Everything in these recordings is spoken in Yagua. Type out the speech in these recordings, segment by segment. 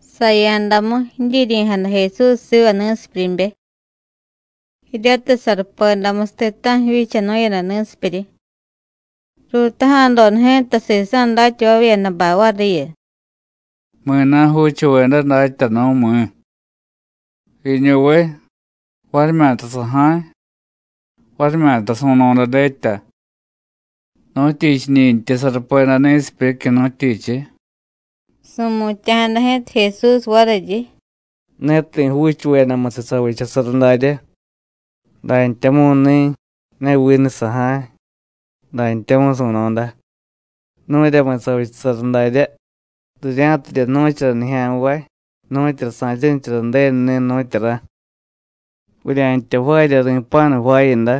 Saya̱damu, jidyiryi̱jada Jesús siva ni̱sipyuryibe, jiryatiy sarupedamusiy ti̱ta̱ju̱ jivyichanu̱yada ni̱sipyuryi. Ruutaja̱doda ji̱ta sisa̱ datyavavyedabay variyu: “¿Mi̱na̱ juuchuveda, Datyanu̱, mi̱? ¿Jiñuviy, varimyata saja̱y, varimyata su̱no̱da dyetya? ¿Nu̱tyichiñintyi sarupeda ni̱sipyuryicyu̱, nu̱tyichiy?” Su̱mutya̱jada ji̱ta Jesús variryi: “Ne ti̱ juuchuvedamusiy savichasara daryá, dantyamu̱ni̱, ne vinu saja̱y, dantyamu̱y su̱no̱da. Nu̱ryamu savichasara daryá, rirya̱tidye jnu̱chara nijya̱nvay nu̱tyura sa̱chanichara Ju̱denuni̱, nu̱tyura. Vurya̱ntya jvaarya ri̱pa̱nu jvaayada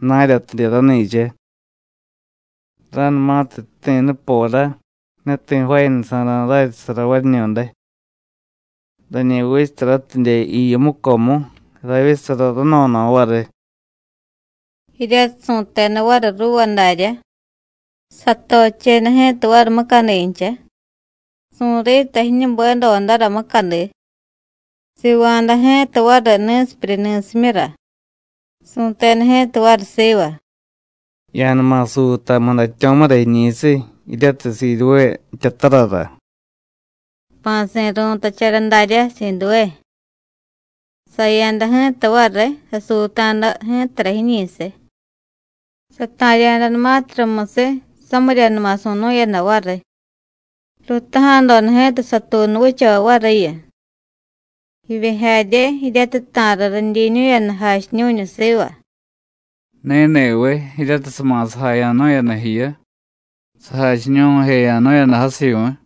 jna̱ryatidye rani̱cha. Ra̱numatiy jti̱ nupora, ne ti̱ jvaayadasa̱ra̱ raryichasara variñu̱day. Rañi vichasaratidye jiyu mucomu, ravyichasara rano̱no̱ variy.” Jiryatiy su̱teda variy ruuva daryá, satocheda ji̱ta variy mucadincha, su̱rita jiñubedodara mucadi, siiva̱da ji̱ta variy ni̱sipyuryi ni̱simyura. Su̱teda ji̱ta variy siva: “Ya̱numa suuta mudatyo̱mura jiñi̱siy, jiryatiy Siduvé jtyatarara.” (Jpa̱si̱ ru̱tachara darya Siduvé). Saya̱da ji̱ta variy, sasuuta̱da ji̱tara jiñi̱siy, sata̱rya̱danumatiy rumusiy, samiryanuma su̱nu̱yada variy. Ruutaja̱doda ji̱ta satuunu vichavay variyu, jivye jarye jiryatiy ta̱riy ridyiñu̱yada jachiñu̱ñu siva: “¿Ni̱ni̱viy, jiryatiy sama̱sajaya̱nu̱yada jiyu, sajachiñu̱jeya̱nu̱yada jasivyu̱y?”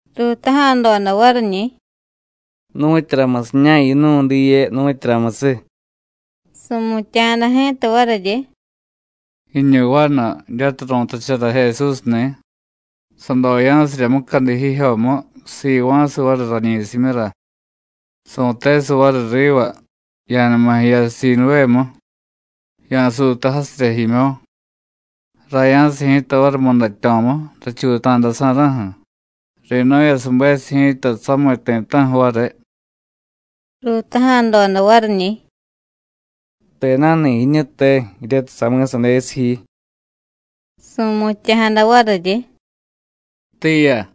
Ruutaja̱doda variñi̱: “¿Nu̱tyuramusiña̱ yinu̱y diye, nu̱tyuramusiy?” Su̱mutya̱jada ji̱ta variryi: “Jiñu vanu jiryatiy ru̱tachara Jesúsni̱, sadoya̱sirya mucadi jijyomu, siva̱siy variy rañi̱simyura. Su̱tesiy variy riva: Ya̱numa jiya Siduvému, ya̱suuta jasirya jimyo̱. Raya̱siy ji̱ta variy mudatyo̱mu, rachuuta̱dasa̱ra̱ju̱, ri̱nu̱yasubesiy ji̱ta samiy ti̱ta̱ju̱ variy.” Ruutaja̱doda variñi̱: “¿Tena̱ni̱ jiñu, te? jiryatiy sami̱sadesiy ji.” Su̱mutya̱jada variryi: “Tiiya.”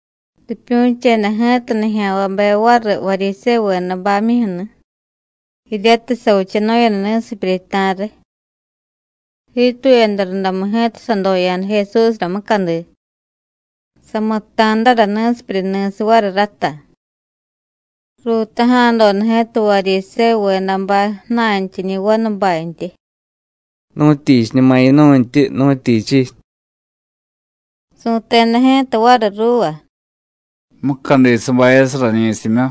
Ripyu̱cheda ji̱ta nijya̱nvabe variy Varyisévuvedabamyuju̱ni̱ jiryatiy savichanu̱yada ni̱sipyuryi ta̱riy. Jiituyada rundamu ji̱ta sadoya̱da Jesúsra mucadi, samutta̱dara ni̱sipyuryi ni̱siy variy ráta. Ruutaja̱doda ji̱ta Varyisévuvedabay ju̱na̱ntyiñi̱ vanubantyi: “¿Nu̱tyichiñuma yinu̱ntyi, nu̱tyichiy?” Su̱teda ji̱ta variy ruuva: “Mucadi sabayasiy rañi̱simyu,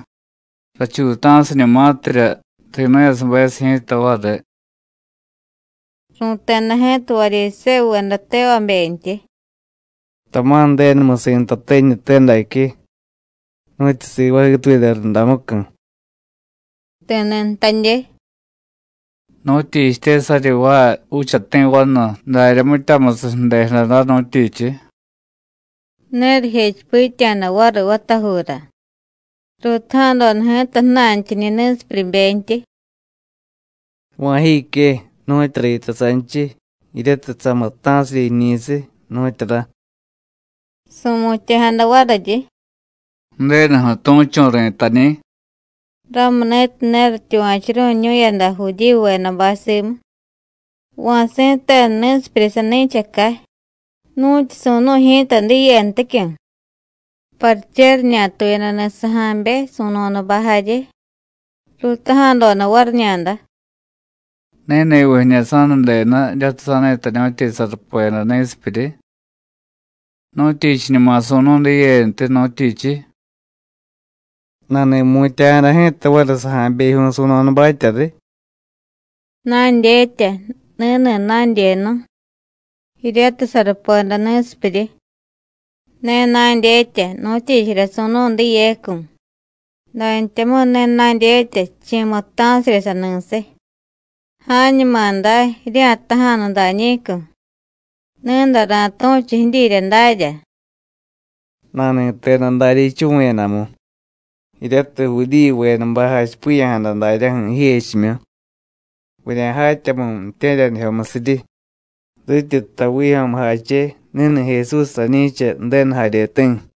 rachuuta̱siñumatirya, ri̱nu̱yasubesiy ji̱ta variy.” Ru̱teda ji̱ta Varyisévuveda tevabentyi: “Tama̱ Ju̱denumusi̱ ntate jiñute daque, nu̱tyu sivaay jiituyada rundamucu̱.” Ti̱ni̱ jtadye: “¿Nu̱tyichitye saryi jvaay juuchati̱ vanu darya mityamusiy ju̱dejada day, nu̱tyichiy?” Ne rijechipitya̱da variy vatajuura. Ruutaja̱doda ji̱ta ju̱na̱ntyiñi̱ ni̱sipyuryibentyi: “¿Va̱ jique, nu̱tyura yitay sanchiy jiryatiy samutta̱sirya jiñi̱siy, nu̱tyura?” Su̱mutya̱jada variryi: “Ju̱denuju̱ tu̱chu̱ ri̱tañi̱.” Ramuni̱tiy ne rityuva̱churu̱ñu̱yada Judíyuvedabay simu, va̱ si̱tenu ni̱sipyuryi sani̱chacay, nu̱tyu su̱nu̱y ji̱ta diyenticyu̱. Pariche riñatuyadani̱ saja̱be, su̱no̱dabay jarye, ruutaja̱doda variñada: “¿Ni̱ni̱viy jiñu sa̱nudenu jiryatiy sa̱ni̱tañu̱tyi sarupeda ni̱sipyuryi? ¿Nu̱tyichiñuma su̱nu̱y diyentiy, nu̱tyichiy?” Nani̱mutya̱jada ji̱ta variy saja̱bejyu̱y, su̱no̱dabatya riy: “Na̱dyetya ni̱ni̱ na̱dyenu, jiryatiy sarupeda ni̱sipyuryi. Ne na̱dyetya nu̱tyichirya su̱nu̱y diyecu̱, dantyamu̱y ne na̱dyetya chi̱ mutta̱sirya sani̱siy. Ja̱ñuma day, jirya̱jtaja̱nu dañi̱cu̱, ni̱day ra̱tu̱chu jidyirya darya.” Nani̱teda daryá jichuvu̱yadamu, jiryatiy Judíyuvedabay jachipiya̱jada daryaju̱ jijechimyu: “Vurya̱jatyamu̱y ju̱tye̱ryanijyomusiryi rityi jtay vijyo̱mujache: Ni̱ni̱ Jesús rañi̱cha Ju̱denu jaryeti̱.”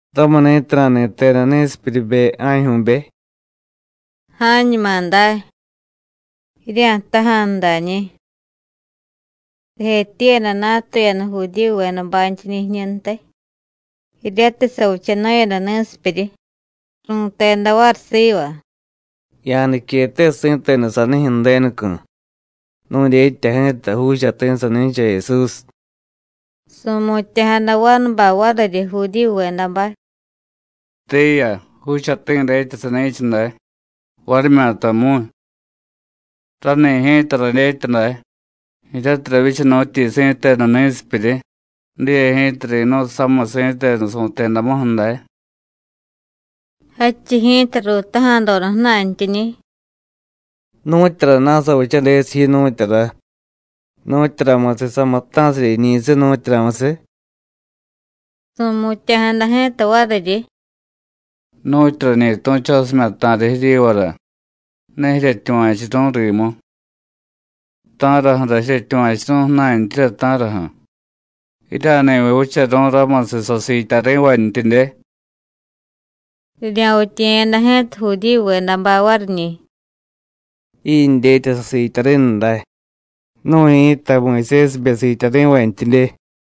Ramuni̱tiy nani̱teda ni̱sipyuryibe ja̱jyu̱be: “Ja̱ñuma day, jirya̱jtaja̱nu dañi̱.” Rijetyiiyada natuyada Judíyuvedabantyiñi̱ jiñuntiy, jiryatiy savichanu̱yada ni̱sipyuryi. Ru̱teda variy siva: “Ya̱niquete si̱tenu sanijyu̱ Ju̱denucu̱. Nu̱dyetya ji̱ta juuchati̱ sani̱cha Jesús.” Su̱mutya̱jada vanubay variryi Judíyuvedabay: “Tiiya, juuchati̱ dyetya sani̱cha day, varimyatamu̱y. Rani̱ ji̱ta radyetya day, jiryatiy ravyichanu̱tyi si̱tenu ni̱sipyuryi, diye ji̱ta ri̱nu̱y samiy si̱tenu su̱tedamuju̱ day.” Jadchiy ji̱ta ruutaja̱doda ju̱na̱ntyiñi̱: “¿Nu̱tyurana̱ savichadesiy ji, nu̱tyura? ¿Nu̱tyuramusiy samutta̱sirya jiñi̱siy, nu̱tyuramusiy?” Su̱mutya̱jada ji̱ta variryi: “Nu̱tyu rañi tu̱chosimya̱ ta̱riy jiryivara, ne jiryetyuva̱churu̱y rimu. ¿Ta̱raju̱ra jiryetyuva̱churu̱y ju̱na̱ntyirya, ta̱raju̱? ¡Jirya̱ni̱viy vicharu̱y ramusiy sasiityari̱vantyidye!” Rirya̱vityiye̱yada ji̱ta Judíyuvedabay variñi̱: “Jindyetya sasiityari̱nu day, nu̱y ji̱ta Muyusésibe siityari̱vantyidye.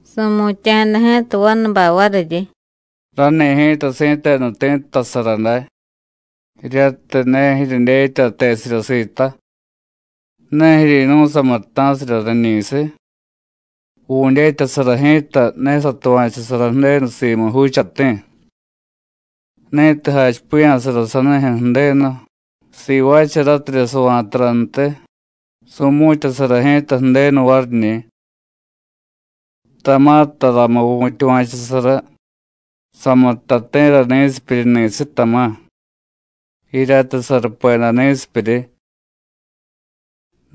Su̱mutya̱jada ji̱ta vanubay variryi: “Rani̱ ji̱ta si̱tenu ti̱ttasara day, jiryatiy ne jiryedyetya tesirya sita. ¿Ne jiryi̱nu̱y samutta̱sirya rañi̱siy? Vu̱dyetyasara ji̱ta ne satuva̱chusara Ju̱denu simu juuchati̱. Ni̱tiy jachipiya̱sara sanijyu̱ Ju̱denu, sivaacharatirya sava̱tarantiy, su̱mu̱tyasara ji̱ta Ju̱denu variñi̱. Tama̱ taramu̱y vu̱tyuva̱chusara samutta ti̱ra ni̱sipyuryi ni̱siy, tama̱, jiryatiy sarupeda ni̱sipyuryi.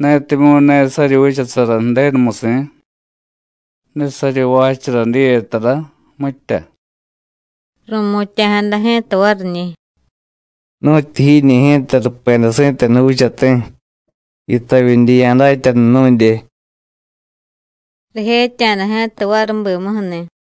Netimyu̱ ne saryi vichasara Ju̱denumusi̱, ne saryi jvaachara diye tara, mitya.” Ru̱mutya̱jada ji̱ta variñi̱: “¡Nu̱tyu jiñi̱ ji̱ta rupeda si̱tenu juuchati̱, yitavyidye ya̱datyanu nu̱dye!” Rijetya̱da ji̱ta variy bimuju̱ni̱.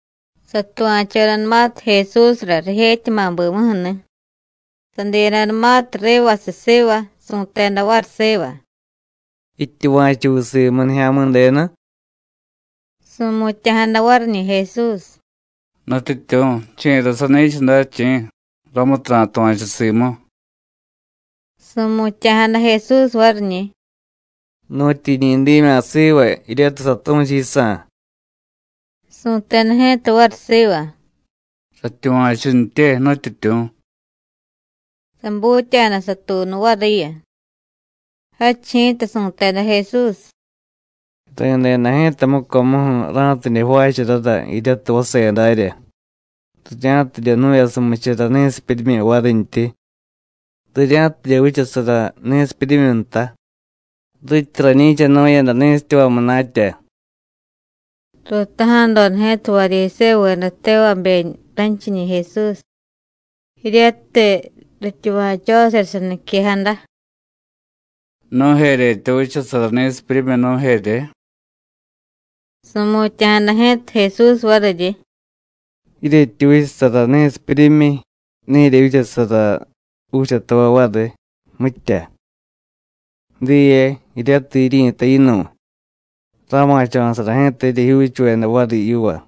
Satuva̱chodanumatiy Jesúsra rijetyama̱ bimuju̱ni̱, sadiyadanumatiy rivasiy siva, su̱teda variy siva: “¿Jityuva̱chuviy simu Nijya̱mi̱denu?” Su̱mutya̱jada variñi̱ Jesús: “¿Nutyityu̱, chi̱ra sani̱cha day, chi̱? ramutiy ra̱tuva̱chu simu.” Su̱mutya̱jada Jesús variñi̱: “Nu̱tyu jiñi dimya̱ siva jiryatiy satu̱chu yisa̱.” Su̱teda ji̱ta variy siva: “Ratyuva̱chuntye, Nutyityu̱.” Sabutya̱da satuunu variyu. Jadchiy ji̱ta su̱teda Jesús: “Ri̱deda ji̱ta mucomuju̱ ra̱tidye jvaacharara jiryatiy vase darya, rirya̱tidye jnu̱yasumichara ni̱sipyuryimyi varintyi, rirya̱tidye vichasara ni̱sipyuryimyi nta rityi rañi̱chanu̱yada ni̱sityavay munatya.” Ruutaja̱doda ji̱ta Varyisévuveda tevabe ranchiñi̱ Jesús, jiryatiy rityuva̱chosirya saniquejada: “¿Nu̱jeryetya vichasara ni̱sipyuryimyi, nu̱jerye?” Su̱mutya̱jada ji̱ta Jesús variryi: “Jiryetyi vichasara ni̱sipyuryimyi, ne jiryevyichasara juuchatavay variy, mitya. Diye, jiryatiy jiryi̱tay yinu̱y, rama̱cho̱sara ji̱ta jiryejyuuchuveda variy yiva.”